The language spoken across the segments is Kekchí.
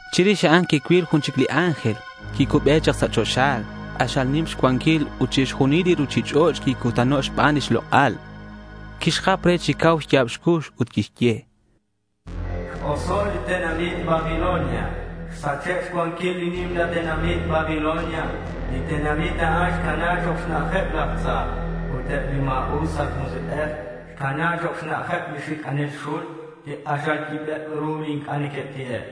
Chirix a'an quicuil jun chic li ángel quicube chak sa' choxa. K'axal nim xcuanquil ut chixjunil li ruchich'och' quicutano' xban lix lok'al. Quixjap re chi cau xya̱b xcux ut quixye: —X-oso' li tenamit Babilonia. Xsache' xcuanquil li nimla tenamit Babilonia. Li tenamit a'an xcana chok' xna'ajeb laj tza ut eb li ma̱us aj musik'ej. Xcana chok' xna'ajeb laj xic'anel xul li k'axal yibeb ru li inc'a' neque'ti'e'.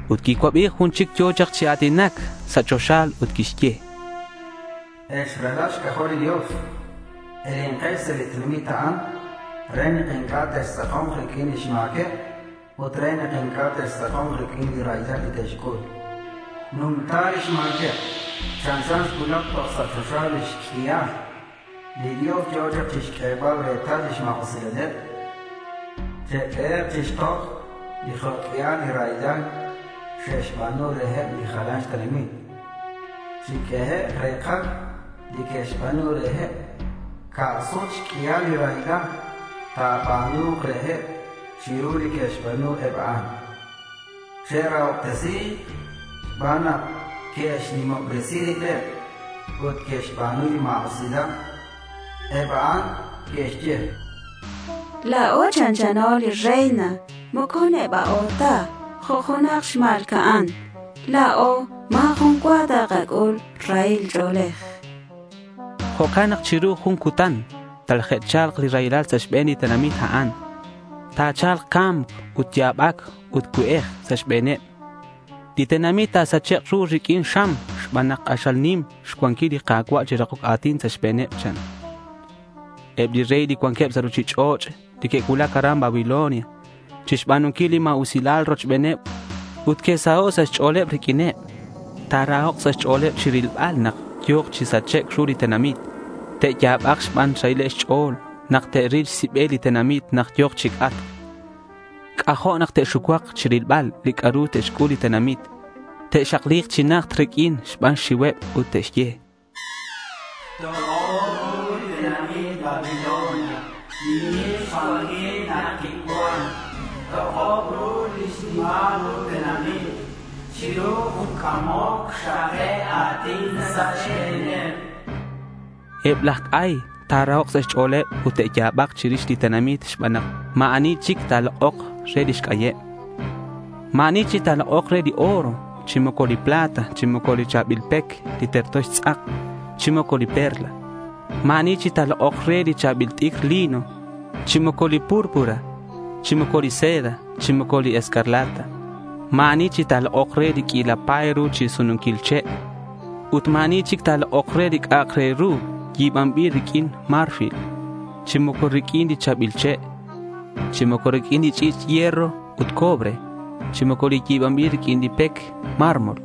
Ut quicuabi jun chic yo̱ chak chi a̱tinac sa' choxa ut quixye: —Ex ralal xc'ajol li Dios, elenkex sa' li tenamit a'an re nak inc'a' textz'ako̱nk riq'uin lix ma̱queb ut re nak inc'a' textz'ako̱nk riq'uin li raylal li te'xc'ul. Xnumta lix ma̱queb. Chanchan xcuulac toj sa' choxa lix q'uial. Li Dios yo̱ chak chixq'uebal retal lix ma̱usilaleb. Che'q'uehek' chixtoj li jo' q'uial li raylal xe'xba̱nu reheb li jalaneb xtenamit. Chiq'uehek' re̱kaj li que'xba̱nu reheb. Ca' sut xq'uial li raylal ta̱ba̱nu̱k reheb chiru li que'xba̱nu eb a'an. Che'rahobtesi̱k xban nak que'xnimobresi ribeb ut que'xba̱nu li ma̱usilal. Eb a'an neque'xye, “La̱o chanchano li reina. Moco neba'o ta jo' junak xma̱lca'an. La̱o ma̱ jun cua takac'ul rahil ch'o̱lej,” chanqueb. Jo'can nak chiru jun cutan talaje'cha̱lk li raylal sa' xbe̱n li tenamit a'an. Ta̱cha̱lk ca̱mc, ut ya̱bac ut cue'ej sa' xbe̱neb. Li tenamit ta̱sachek' ru riq'uin xam xban nak k'axal nim xcuanquil li Ka̱cua' li ta̱rakok a̱tin sa' xbe̱neb, chan. Eb li rey li cuanqueb sa' ruchich'och' li que'cuulac aran Babilonia chixba̱nunquil li ma̱usilal rochbeneb ut que'saho' sa' xch'o̱leb riq'uineb, ta̱rahok' sa' xch'o̱leb chirilbal nak yo̱k chi sachec' ru li tenamit. Te'ya̱bak xban xrahil xch'o̱leb nak te'ril xsibel li tenamit nak yo̱k chi c'atc. C'ajo' nak te'xucuak chirilbal li c'a'ru tixc'ul li tenamit. Te'xakli̱k chi najt riq'uin xban xxiuheb ut te'xye: —Tok'ob ru li tenamit Babilonia li nim xcuanquil nak quicuan. Tok'ob ru lix nimal ru tenamit. Chiru jun c'amoc xrake' a̱tin sa' xbe̱neb.— Eb laj c'ay ta̱rahok' sa' xch'o̱leb ut te'ya̱bak chirix li tenamit xban nak ma̱ ani chic ta̱lok'ok re lix c'ayeb. Ma̱ ani chic ta̱lok'ok re li oro, chi moco li plata, chi moco li cha̱bil pec li terto xtz'ak, chi moco li perlas. Ma̱ ani chic ta̱lok'ok re li cha̱bil t'icr lino, chi moco li púrpura, chi moco li seda, chi moco li escarlata. Ma̱ ani chic ta̱lok'ok re li q'uila pa̱y ru chi sununquil che'. Ut ma̱ ani chic ta̱lok'ok re li c'a'ak re ru yi̱banbil riq'uin marfil, chi moco riq'uin li cha̱bil che', chi moco riq'uin li ch'i̱ch' hierro ut cobre, chi moco li yi̱banbil riq'uin li pec mármol.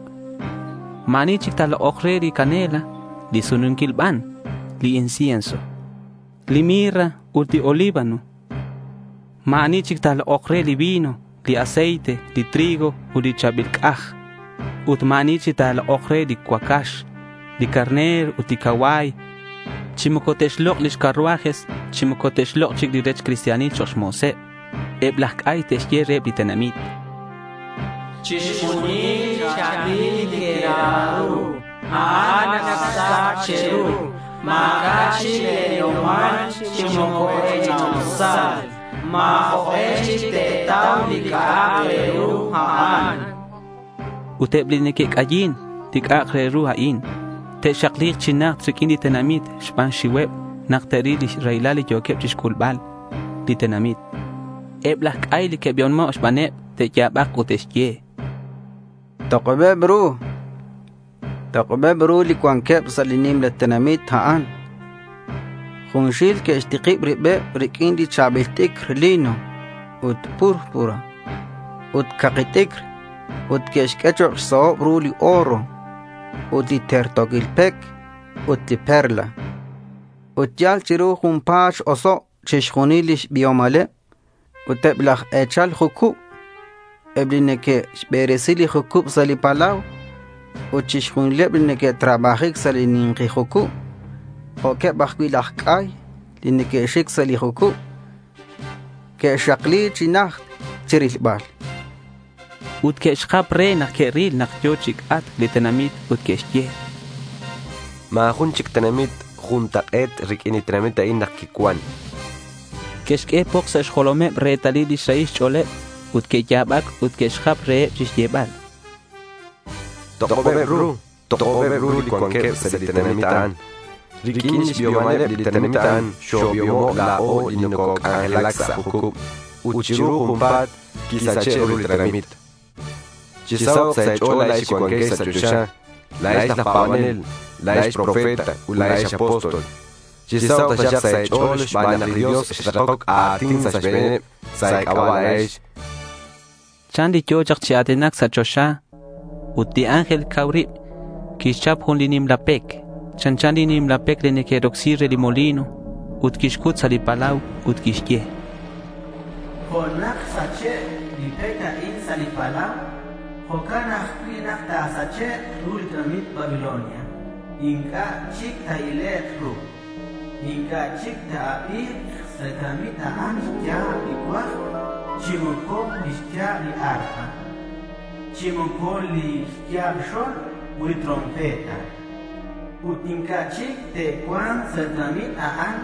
Ma̱ ani chic ta̱lok'ok re li canela, li sununquil ban, li incienso, li mirra ut li olíbano. Ma̱ ani chic ta̱lok'ok re li vino, li aceite, li trigo ut li cha̱bil c'aj. Ut ma̱ ani chic ta̱lok'ok re li cuacax, li carner ut li cacua̱y, chi moco te'xlok' li carruajes, chi moco te'xlok' chic li rech cristianil chok' mo̱seb. Eb laj c'ay te'xye reheb li tenamit: —Chixjunil li cha̱bil li quera ru, a'an ac xsach che̱ru. Ma̱c'a' chic le̱ biomal chi moco e̱ch'ina'usal. Ma̱ jok'e chic te̱tau li c'a'ak re ru a'an.— Ut eb li neque'c'ayin li c'a'ak re ru a'in te'xakli̱k chi najt riq'uin li tenamit xban xxiuheb nak te'ril li raylal li yo̱keb chixc'ulbal li tenamit. Eb laj c'ay li que'biomo' xbaneb, te'ya̱bak ut te'xye: —Tok'obeb ru. Tok'obeb ru li cuanqueb sa' li nimla tenamit a'an. Junxil que'xtikib ribeb riq'uin li cha̱bil t'icr lino ut púrpura ut caki t'icr. Ut que'xq'ue chok' xsahob ru li oro, ut li terto̱quil pec ut li perla. Ut yal chiru junpa̱t x-oso' chixjunil lix biomaleb, cha'akeb. Ut eb laj e̱chal jucub ut eb li neque'xberesi li jucub sa' li palau ut chixjunileb li neque'trabajic sa' li ni̱nki jucub, jo'queb laj c'ay li neque'xic sa' li jucub, que'xakli chi najt chi rilbal. Ut que'xjap re nak que'ril nak yo̱ chi c'atc li tenamit ut que'xye: —Ma̱ jun chic tenamit juntak'e̱t riq'uin li tenamit a'in nak quicuan, chanqueb. Que'xq'ue poks sa' xjolomeb retalil lix rahil xch'o̱leb ut que'ya̱bac ut que'xjap reheb chixyebal: —¡Tok'obeb ru! ¡Tok'obeb ru li cuanqueb sa' li tenamit a'an! Riq'uin lix biomaleb li tenamit a'an xobiomo' la̱o li nococ'anjelac sa' jucub. Ut chiru junpa̱t quisache' ru li tenamit, chanqueb. —Chisahok' sa' e̱ch'o̱l la̱ex li cuanquex sa' choxa. La̱ex laj pa̱banel, la̱ex profeta ut la̱ex apóstol, chisahok' taxak sa' e̱ch'o̱l xban nak li Dios xrakoc a̱tin sa' xbe̱neb sa' e̱c'aba' la̱ex, chan li yo̱ chak chi a̱tinac sa' choxa. Ut jun li ángel cau rib quixchap jun li nimla pec, chanchan li nimla pec li neque'rocsi re li molino, ut quixcut sa' li palau ut quixye: —Jo' nak xsach li pec a'in sa' li palau, jo'can ajcui' nak ta̱sachek' ru li tenamit Babilonia. Inc'a' chic ta̱ilek' ru. Inc'a' chic ta̱abi̱k sa' li tenamit a'an lix ya̱b li cuajb chi moco lix ya̱b li arpa, chi moco li xya̱b li xo̱lb ut li trompeta. Ut inc'a' chic te'cua̱nk sa' li tenamit a'an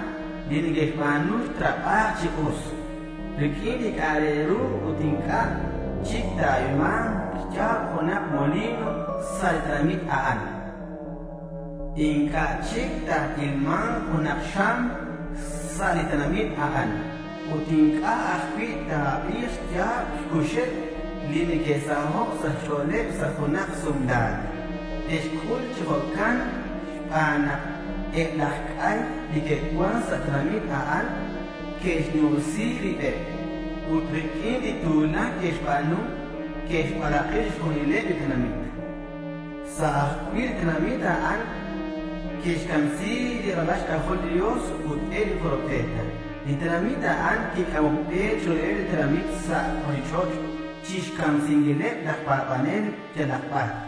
li neque'xnau trabajic chi us riq'uin li c'a'ak re ru, ut inc'a' chic ta̱abi̱k xya̱b junak molino sa' li tenamit a'an. Inc'a' chic ta̱ilma̱nk junak xam sa' li tenamit a'an. Ut inc'a' ajcui' ta̱abi̱k xya̱b xcuxeb li neque'saho' sa' xch'o̱leb sa' junak sumla̱c. Te'xc'ul chi jo'can xban nak eb laj c'ay li que'cuan sa' li tenamit a'an que'xnimobresi ribeb, ut riq'uin li tu̱lac que'xba̱nu, que'xbalak'i chixjunileb li tenamit.— Sa' ajcui' li tenamit a'an que'camsi̱c li ralal xc'ajol li Dios ut eb li profeta. Li tenamit a'an quic'amoc be chiruheb li tenamit sa' ruchich'och' chixcamsinquileb laj pa̱banel yalak bar.